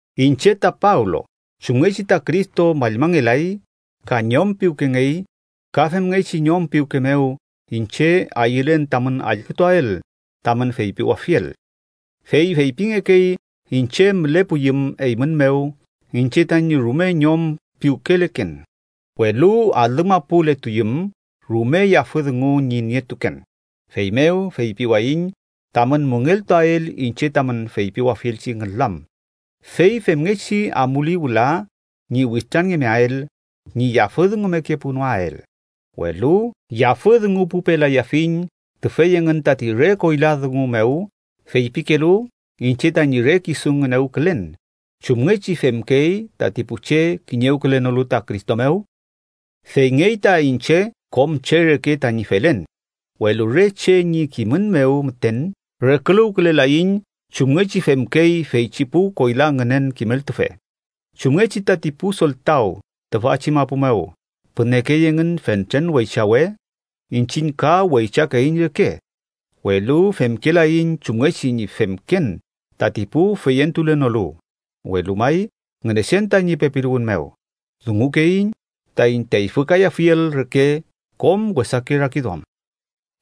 Iñche ta Pablo, chumngechi ta Cristo mallmangelay ka ñom piwkengey, ka femngechi ñom piwke mew iñche ayülen tamün allkütuael tamün feypiwafiel. Fey feypingekey iñche mülepuyüm eymün mew, iñche tañi rume ñom piwkeleken, welu alümapuletuyüm, rume yafü dungu ñi nietuken. Feymew, feypiwayiñ tamün müngeltuael iñche tamün feypiwafielchi ngülam, fey femngechi amuli wüla ñi witranngemeael, ñi yafüdungumekepunoael. Welu ¿yafüdungupupelayafiñ tüfey engün tati re koyla dungu mew feypikelu iñche tañi re kisu ngünewkülen, chumngechi femkey tati pu che kiñewkülenolu ta Cristo mew? Feyngey ta iñche kom che reke tañi felen, welu re che ñi kimün mew müten reküluwkülelaiñ chumngechi femkey feychi pu koyla ngünen kimeltufe. Chumngechi tati pu soltaw tüfachi mapu mew pünekey engün fentren weychawe, iñchiñ ka weychakeiñ reke, welu femkelaiñ chumngechi ñi femken tati pu feyentulenolu, welu may Ngünechen tañi pepiluwün mew dungukeiñ taiñ teyfükayafiel reke kom wesake rakiduam.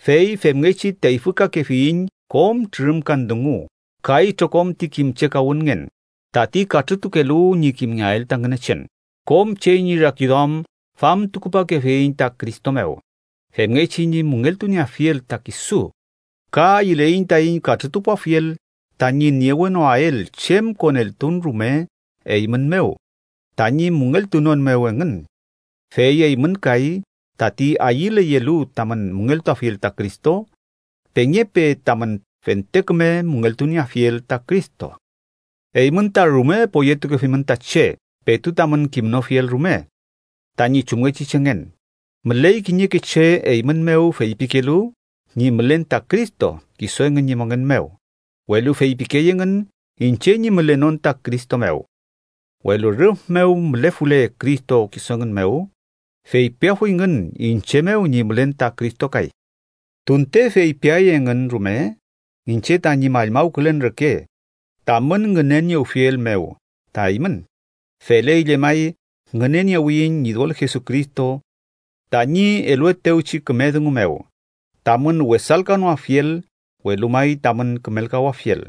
Fey femngechi teyfükakefiyiñ kom trürümkan dungu ka itrokom ti kimchekawünngen, tati katrütukelu ñi kimngeael ta Ngünechen. Kom che ñi rakiduam famtukupakefiyiñ ta Cristo mew, femngechi ñi müngeltunieafiel ta kisu. Ka ayüleiñ taiñ katrütupuafiel tañi niewenoael chem koneltun rume eymün mew tañi müngeltunon mew engün, fey eymün kay tati ayüleyelu tamün müngeltuafiel ta Cristo, pengepe tamün fente küme müngeltunieafiel ta Cristo. Eymün ta rume poyetukefimün ta che petu tamün kimnofiel rume tañi chumngechi chengen. Müley kiñeke che eymün mew feypikelu ñi mülen ta Cristo kisu engün ñi mongen mew, welu feypikey engün iñche ñi mülenon ta Cristo mew. Welu rüf mew mülefule Cristo kisu engün mew, feypiafuyngün iñche mew ñi mülen ta Cristo kay. Tunte feypiay engün rume iñche tañi mallmawkülen reke tamün ngüneniewfiel mew ta eymün, feley llemay ngüneniewiyiñ Ñidol Jesucristo tañi eluetewchi küme dungu mew, tamün wesalkanoafiel, welu may tamün kümelkawafiel.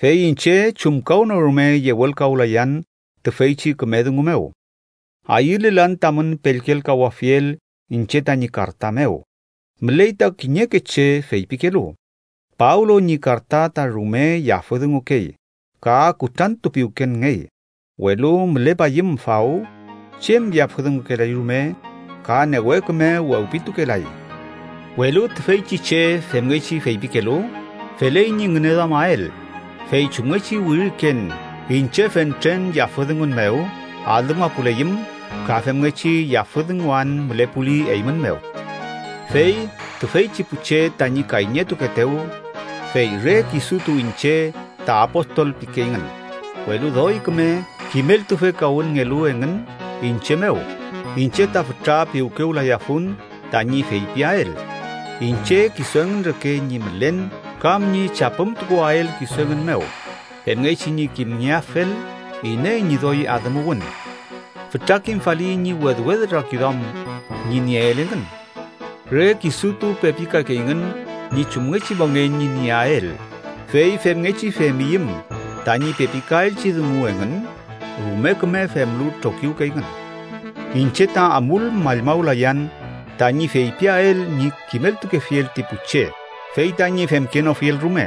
Fey iñche chumkawnorume yewelkawlayan tüfeychi küme dungu mew. Ayülelan tamün pellkelkawafiel iñche tañi karta mew. Müley ta kiñeke che feypikelu: “Pablo ñi karta ta rume yafüdungukey ka kutrantupiwkenngey, welu mülepayüm faw chem yafüdungukelay rume ka newe küme wewpitukelay.” Welu tüfeychi che femngechi feypikelu, feley ñi ngüneduamael fey chumngechi wiriken iñche fentren yafüdungun mew alümapuleyüm, ka femngechi yafüdunguan mülepuli eymün mew. Fey tüfeychi pu che tañi kayñetukeetew, fey re kisutu iñche ta apostol pikeyngün, welu doy küme kimeltufekawünngelu engün iñche mew, iñche ta fütra piwkewlayafun tañi feypiael iñche kisu engün reke ñi mülen kam ñi chapümtukuael kisu engün mew, femngechi ñi kimgeafel iney ñi doy adümuwün. ¡Fütra kimfali ñi wedwed rakiduam ñi nieel engün! Re kisutu pepikakeyngün ñi chumngechi mongen ñi nieael, fey femngechi femyüm tañi pepikaelchi dungu engün, rume küme femlu trokiwkeyngün. Iñche ta amul mallmawlayan tañi feypiael ñi kimeltukefiel ti pu che fey tañi femkenofiel rume.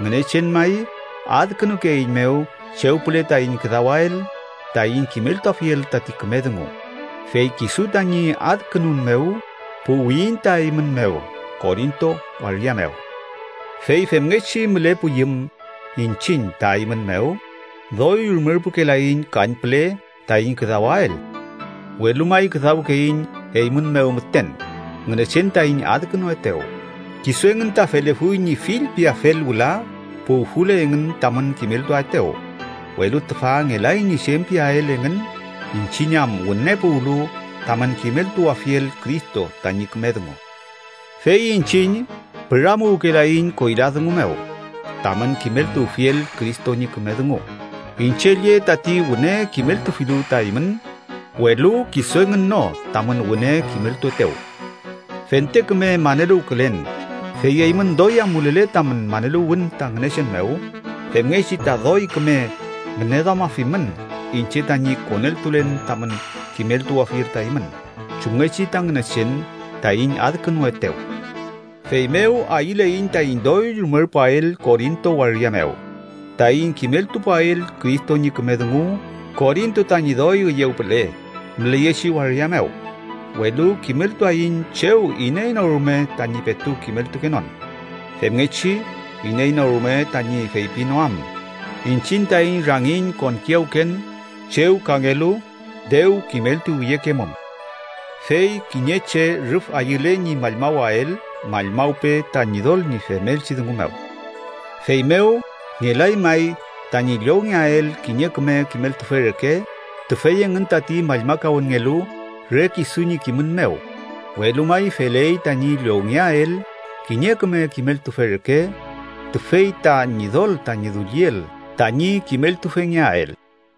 Ngünechen may adkünukeeiñmew chew püle taiñ küdawael taiñ kimeltuafiel tati küme dungu, fey kisu tañi adkünun mew puwiyiñ ta eymün mew Korinto waria mew. Fey femngechi mülepuyüm iñchiñ ta eymün mew, doy rumerpukelaiñ kañpüle taiñ küdawael. Welu may küdawkeiñ eymün mew müten Ngünechen taiñ adkünuetew. Kisu engün ta felefuy ñi fillpiafel wüla puwfule engün tamün kimeltuaetew, welu tüfa ngelay ñi chem piael engün iñchiñ am wüne puwlu tamün kimeltuwafiel Cristo tañi küme dungu. Fey iñchiñ püramuwkelaiñ koyla dungu mew tamün kimeltuwfiel Cristo ñi küme dungu, iñche lle tati wüne kimeltufilu ta eymün, welu kisu engün no tamün wüne kimeltuetew. Fente küme maneluwkülen, fey eymün doy amulele tamün maneluwün ta Ngünechen mew, femngechi ta doy küme ngüneduamafimün iñche tañi koneltulen tamün kimeltuwafiel ta eymün, chumngechi ta Ngünechen taiñ adkünuetew. Feymew ayüleiñ taiñ doy rumerpuael Korinto waria mew taiñ kimeltupuael Cristo ñi küme dungu Korinto tañi doy üyew püle müleyechi waria mew, welu kimeltuaiñ chew iney no rume tañi petu kimeltukenon. Femngechi iney no rume tañi feypinoam iñchiñ taiñ rangiñ konkiyawken chew kangelu dew kimeltuwiyekemum. Fey “kiñe che rüf ayüle ñi mallmawael, mallmawpe ta Ñidol ñi femelchi dungu mew.” Feymew ngelay may tañi llowngeael kiñe küme kimeltufe reke tüfey engün tati mallmakawünngelu re kisu ñi kimün mew, welu may feley tañi llowngeael kiñe küme kimeltufe reke tüfey ta Ñidol tañi dulliel tañi kimeltufengeael.